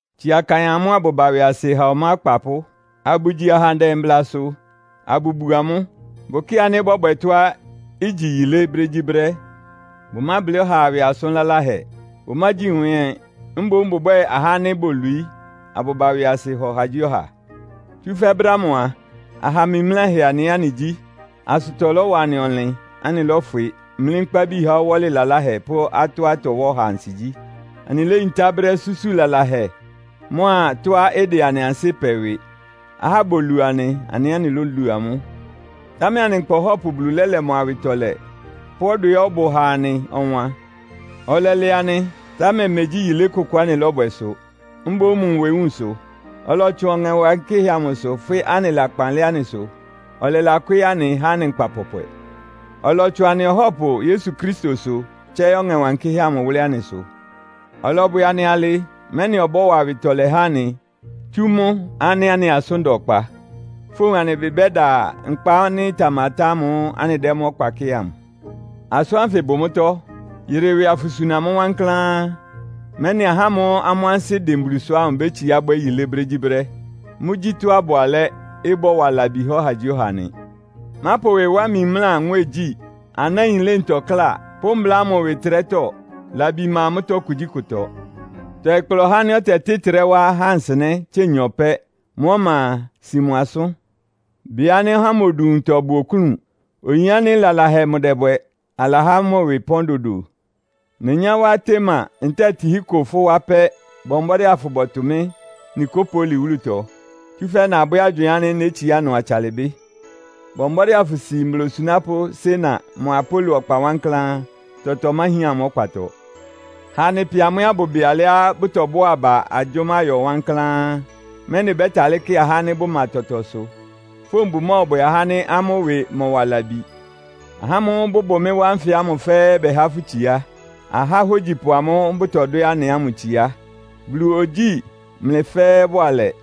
Tsia kaɩn amʋ́ abʋba ɩwɩasɩ ha ɔmá akpapʋ́, abʋgyi ahandɛ mblasʋ, abʋbu amʋ́. Bʋkɩ́ɩ ánɩ́ bɔ́bwɛ tɔ́á igyi yilé brégyíbrɛ́. Bʋmáblɩ́ ɔhaa ɩwɩ asʋn laláhɛ, bʋmágyi nwɛ́ɛn ɛ́. Mboún bʋbwɛ́ɛ ahá ánɩ́ bolwií, abʋba ɩwɩasɩ ha ɔhagyíɔha. Tsúfɛ́ brɛ́ ámʋ a, aha mimláhɛ anɩ ɛ́ anɩgyí. Asʋtɔ lɔ́wa anɩ ɔnlɩn. Anɩlɔ́fwɩ, mlí nkpábi há ɔwɔ́lɩ laláhɛ pʋ́ atɔ́á ɩtɔwá ɔha ansigyí. Anɩléyintá brɛ́ súsu lalahɛ mʋ́a tɔ́á ɩdɛ anɩ ansɩ́ pɛ ɩwɩ. Ahá bolu anɩ, anɩ ɛ́ anɩlólu amʋ́. Támɛ anɩ nkpa Ɔhɔ́pʋ Bulu lɛ́lɛ mʋ awɩtɔlɛ pʋ́ ɔdwɛá ɔbʋ ha anɩ ɔwan. Ɔlɛlɛ anɩ, támɛ megyí yilé kʋkʋ anɩlɔ́bwɛ sʋ, mboún mʋ nwewúun sʋ. Ɔlɔtsʋn Ɔŋɛ Wankɩ́hɛ́ amʋsʋ fwɩ́ anɩ lakpan lɛ́ anɩsʋ, ɔlɛlakwɩ́ɩ́ anɩ, há anɩ nkpa pɔpwɛ. Ɔlɔtsʋn anɩ Ɔhɔ́pʋ Yesu Kristosʋ, tsɛ́ɩ́ Ɔŋɛ Wankɩ́hɛ́ amʋ wʋ́lɩ́ anɩsʋ. Ɔlɔbwɛ anɩ alɩ, mɛ́nɩ ɔbɔ́wa awɩtɔlɛ há anɩ, tsú mʋ́ ánɩ́ anɩ asʋ́n da ɔkpa, fówun anɩ ɩbɩ bɛ́da nkpa ánɩ́ ɩtamatá ámʋ́ʋ́ anɩdɛ́ mʋ́ ɔkpa kɩ́ɩ amʋ. Asʋ́n ánfɩ bʋ mʋ́tɔ́. Yɩrɩ ɩwɩ afʋsuna mʋ́ wankláán, mɛ́nɩ ahá ámʋ́ʋ́ amʋ́ ansɩ́ dɩn Bulusʋ ámʋ bétsiá bwɛ́ yilé brégyíbrɛ́. Mʋ́gyí tɔ́á ɩbʋ alɛ́, ɩbɔ́wa labi há ɔhagyíɔha nɩ. Mápʋ ɩwɩ wá mimlá nwɛ́ɛngyí, anáin ɩlɩ́ntɔ kláa, pʋ́ mbla ámʋ ɩwɩ ɩtrɛ́tɔ́. Labi ma mʋ́tɔ́ kugyíkʋtɔ. Tɔɩ kpla ɔhá ánɩ́ ɔtɛtɩ́ ɩtrɛ́ wá ahá nsɩnɛ́ tse nyɔ pɛ́. Mʋ́ ɔma a, si mʋ asʋ́n. Bɩ ánɩ́ ɔhá ámʋ odu nwuntɔ bʋ oklún. Oyin ánɩ́ lalahɛ mʋdɛbwɛ. Alahá mʋ ɩwɩ pɔ́n dodo. Nenyá wá Artema ntɛ́ɛ Tihiko fʋ́ wá pɛ́, bɔ mbɔ́dɩ́ afʋbɔtʋ mɩ́ Nikopoli wúlutɔ, tsúfɛ́ nabwɛ́ agywɩɩn ánɩ́ nétsiá ɩnʋ atsalɩ bɩ́. Bɔ mbɔ́dɩ́ afʋsi mbla osunápʋ́ Sena mʋa Apolo ɔkpa wankláán. Tɔtɔ ɩmáhián amʋ́ ɔkpatɔ. Ha anɩ pɩ amʋ ɛ́ abʋbɩ alɩá bʋtɔbʋ́a aba agyʋ́má yɔ wankláán, mɛ́nɩ bɛ́talɩ́ kɩ ahá ánɩ́ bʋma tɔtɔsʋ. Fówun bʋmɔ́ɔbwɛ ahá ánɩ́ amʋ́ ɩwɩ mɔ́wa labi. Ahá ámʋ́ʋ́ bʋbʋ mɩ́ wá nfɩ ámʋ fɛ́ɛ́ bɛhá fʋ́ itsiá. Ahá ahógyipʋ amʋ́ʋ́ bʋtɔdwɛ́ anɩ ámʋ itsiá. Bulu ogyíi mlɩ fɛ́ɛ́ bʋalɛ.